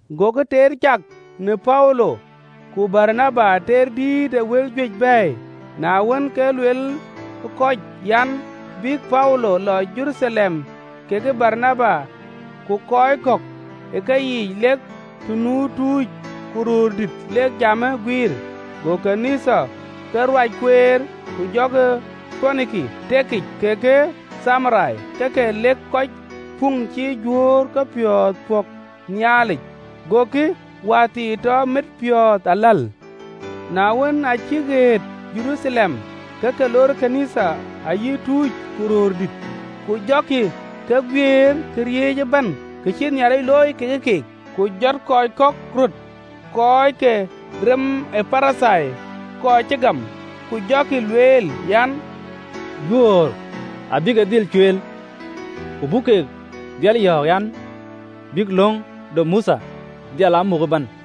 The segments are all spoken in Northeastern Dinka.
Gokï teer cak në Paulo ku Baranaba, teer dït ë wël juëc bɛ̈ɛ̈i, na wën, ke lueel kɔc an, bï Paulo lɔ Jeruthalem kekë Baranaba, ku kɔc kɔ̈k ë keyiic, lek të nu tuuc ku röördït, lek jamë guiir. Go kɔc ke ɣön ë Nhialic ke ruac kueer, ku jɔkï tëëk në Poiniki kekë Thamaria, ke ke lëk kɔc puŋ cï Juöör kepiɔ̈ɔ̈th pɔ̈k Nhialic, gokï wäthii tɔ mit piɔ̈ɔ̈th aläl. Na wën, aa cïk ɣet Jeruthalem, ke ke loor ɣön ë Nhialic ayï tuuc ku röördït, ku jɔkï ke guiëër këriëëc ëbɛ̈n ka cïï Nhialic looi kekë keek. Ku jɔt kɔc röt, kɔc ke rem ë Parithai kɔc cï gam, ku jɔkï lueel an, “Juöör abï ke dhil cueel, ku abuk keek dhil yɔ̈ɔ̈k, bïk löŋ de Mothe dhil aa muk ëbɛ̈n.”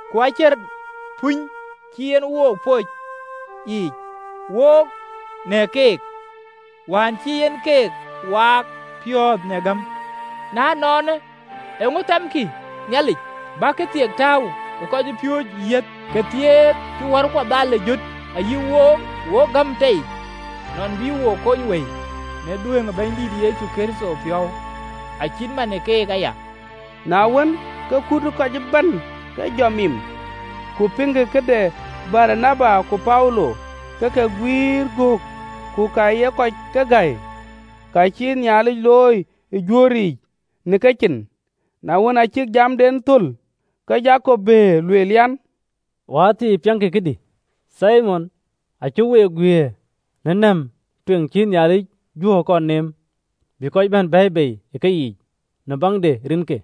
Ku acïn puny cï en wo pɔ̈ɔ̈c yiic, wook në keek, wään cï en keek waak piɔ̈ɔ̈th në gäm. Na ënɔɔnë, eeŋö thɛ̈mkï Nhialic, bäk këthiek tääu ë kɔcpiööcë yiëth, këthiek cï wärkuɔ dhal ë jöt ayï wook? Wok gam tei nɔn bï wo kony wëi në dhuëëŋ ë Bɛ̈nydït Yecu Kërtho piɔ̈u, acït man ë kek aya.” Na wën, ke amatnɔm ëbɛ̈n ke ke jɔ mim, ku piŋkï këde Baranaba ku Paulo, ke ke guiir göök ku ka ye kɔc ke gäi, ka cïï Nhialic looi ë Juöör yiic në kecin. Na wën, aa cïk jamden thöl, ke Jakop bëër, lueel an, “Wäthii, piɛŋkï këdï! Thimon acï week guiëër në nɛ̈m tueŋ cï Nhialic Juöör kɔn neem, bï kɔc bɛ̈n bɛ̈ɛ̈i bei ë keyiic, në baŋ de rinke.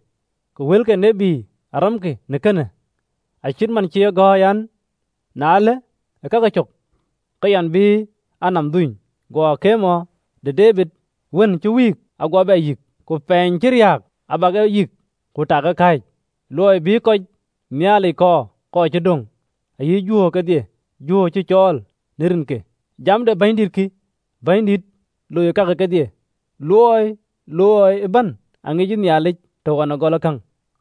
Ku wël ke tiët arɛ̈mkï në kënë, acït man cï e gɔ̈ɔ̈r, an, (LXX). ‘Na ëlë e kake cök, ke yɛn bï a nɔm dhuny, Guɔ paany de Debid wën cï wïïk aguɔ bɛ yïk. Ku pɛɛny cï riääk abä ke bɛ yïk, Ku ta ke be kɔ̈ɔ̈c. Luɔi bï kɔc Nhialic kɔɔr, kɔc cï döŋ, Ayï Juöör kedhie Juöör cï cɔl në rinkï, Jam de Bɛ̈nydït kï, Bɛ̈nydït loi kake kedhie. Luɔi looi ëbɛ̈n aŋic Nhialic të ɣɔn gɔlë käŋ.’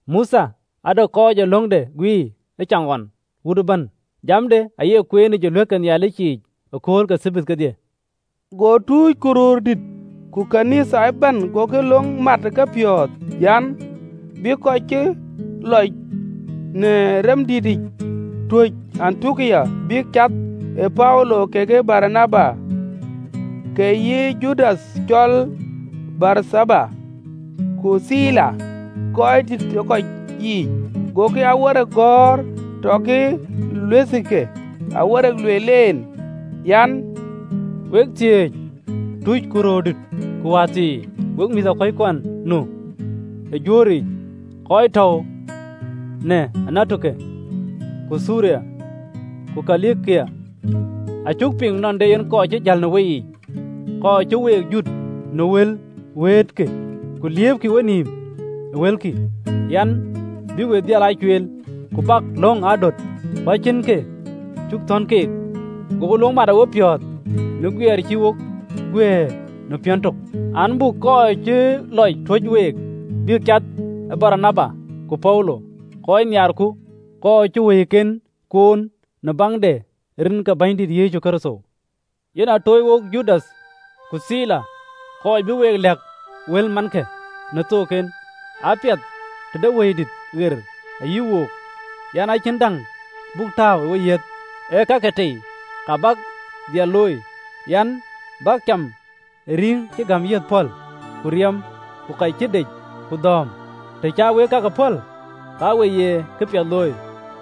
Mothe ade kɔc ee löŋde guiir ëcaŋɣɔn ë wuöt ëbɛ̈n yiic, jamde aye kueenic ë ɣööt ke Nhialic yiic ë akööl ke Thabath kedhie.” Go tuuc ku röördït ku ɣön ë Nhialic ëbɛ̈n agokï löŋ mat ë kepiɔ̈ɔ̈th, an, bïk kɔc cï lɔc në remdenic tuɔɔc Antiokia, bïk cath ë Paulo kekë Baranaba, ke yï Judath cɔl Barthaba, ku Thila, röördït ë kɔc yiic, gokï awerek gɔ̈ɔ̈r tɔkï luɛthkï, awerek lueel en, an: “Wek thiëëc tuuc ku röördït ku wäthii, wek mïthëkɔckuɔn nu ë Juöör yiic, kɔc tɔ̈u në Antiokia, ku Thiriya, ku Kilikia: Acuk piŋ nɔn de kɔc kɔ̈k cï jäl ë woyiic, kɔc cï week jut në wël wëëtë ke, ku liëëpkï wenïïm, luelkï, an, bï we dhil cueel, ku bäk löŋ aa döt, ku acïn kë cuk thɔ̈n keek. Agoku löŋ mat ë wopiɔ̈ɔ̈th në guëër cï wo guëër në piɔ̈n tök, an, buk kɔc cuk lɔc tuöc week bïk cath ë Baranaba ku Paulo, kɔc nhiaarku, kɔc cï wëiken kuɔɔn në baŋ de rin ke Bɛ̈nydan Yecu Kërtho. Yen a toc wok Judath ku Thila, kɔc bï we lɛ̈k wëlmankë në kethook. Apiɛth tëde Wëidït ɣer ayï wook an, acïn däŋ buk tääu ë weyiëth, ee kakë tei kek bäk dhil looi, an, bäk cäm ë rïŋ cï gam yiëth pɔ̈l, ku riɛm, ku ka cï dec, ku dhööm, të cä wek kakë pɔ̈l, ka we ye këpiɛth looi.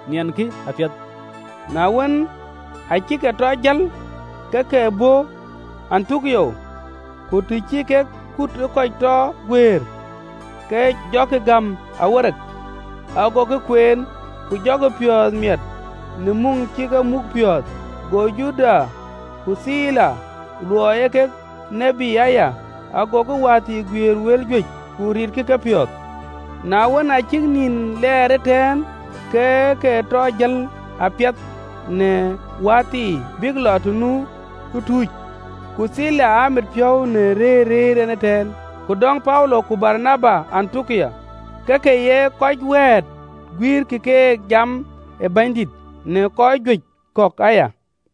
Niɛnkï apiɛth. Na wën, aacï ke tɔ jël, ke ke bɔ̈ Antiokia, ku të cï kek akutnɔm ë kɔc tɔ guëër, ke ke jɔkï gäm awerek. Agokï kueen, ku jɔkï piɔ̈ɔ̈th miɛt në muŋ cï ke muk piɔ̈ɔ̈th. Go Judath ku Thila, luɔi ee kek tït aya, agokï wäthii guiëër wël juëc, ku ritkï kepiɔ̈ɔ̈th, Na wën, aa cïk nïn lɛɛr ëtɛ̈ɛ̈n, ke ke tɔ jël apiɛth në wäthii bïk lɔ të nu tuuc. Ku Thila amit piɔ̈u në rëër rëër en ëtɛ̈ɛ̈n. Ku dɔ̈ŋ Paulo ku Baranaba Antiokia, ke ke ye kɔc wɛ̈ɛ̈t ku guïïrkï keek jam de Bɛ̈nydït, në kɔc juëc kɔ̈k aya.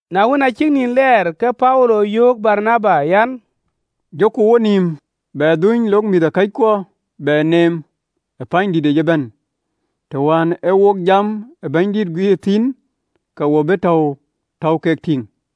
Na wën, aa cïk nïn lɛɛr, ke Paulo yöök? Baranaba an, “Jɔku wonïïm bɛ dhuny lok mïthëkɔckuɔ bɛ neem ë pänydït yiic ëbɛ̈n të wään ee wok jam ee Bɛ̈nydït guiir thïn, ke wo bï täu tɔ̈u kek tïŋ.”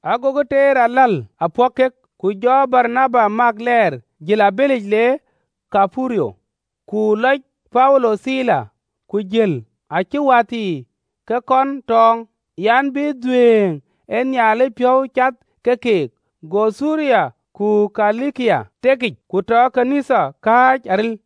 Agokï teer aläl apɔ̈k kek, ku jɔ Baranaba Mak lɛɛr, jël abëlic le Thaiperuth, Ku lɔc Paulo Thila, ku jël, acïï wäthii ke kɔn tɔ̈ɔ̈ŋ an, bï dhuëëŋ ë Nhialic piɔ̈u cath ke keek. Go tëëk në Thiriya ku Kilikia, ke tɔ ɣööt ke Nhialic kääc aril.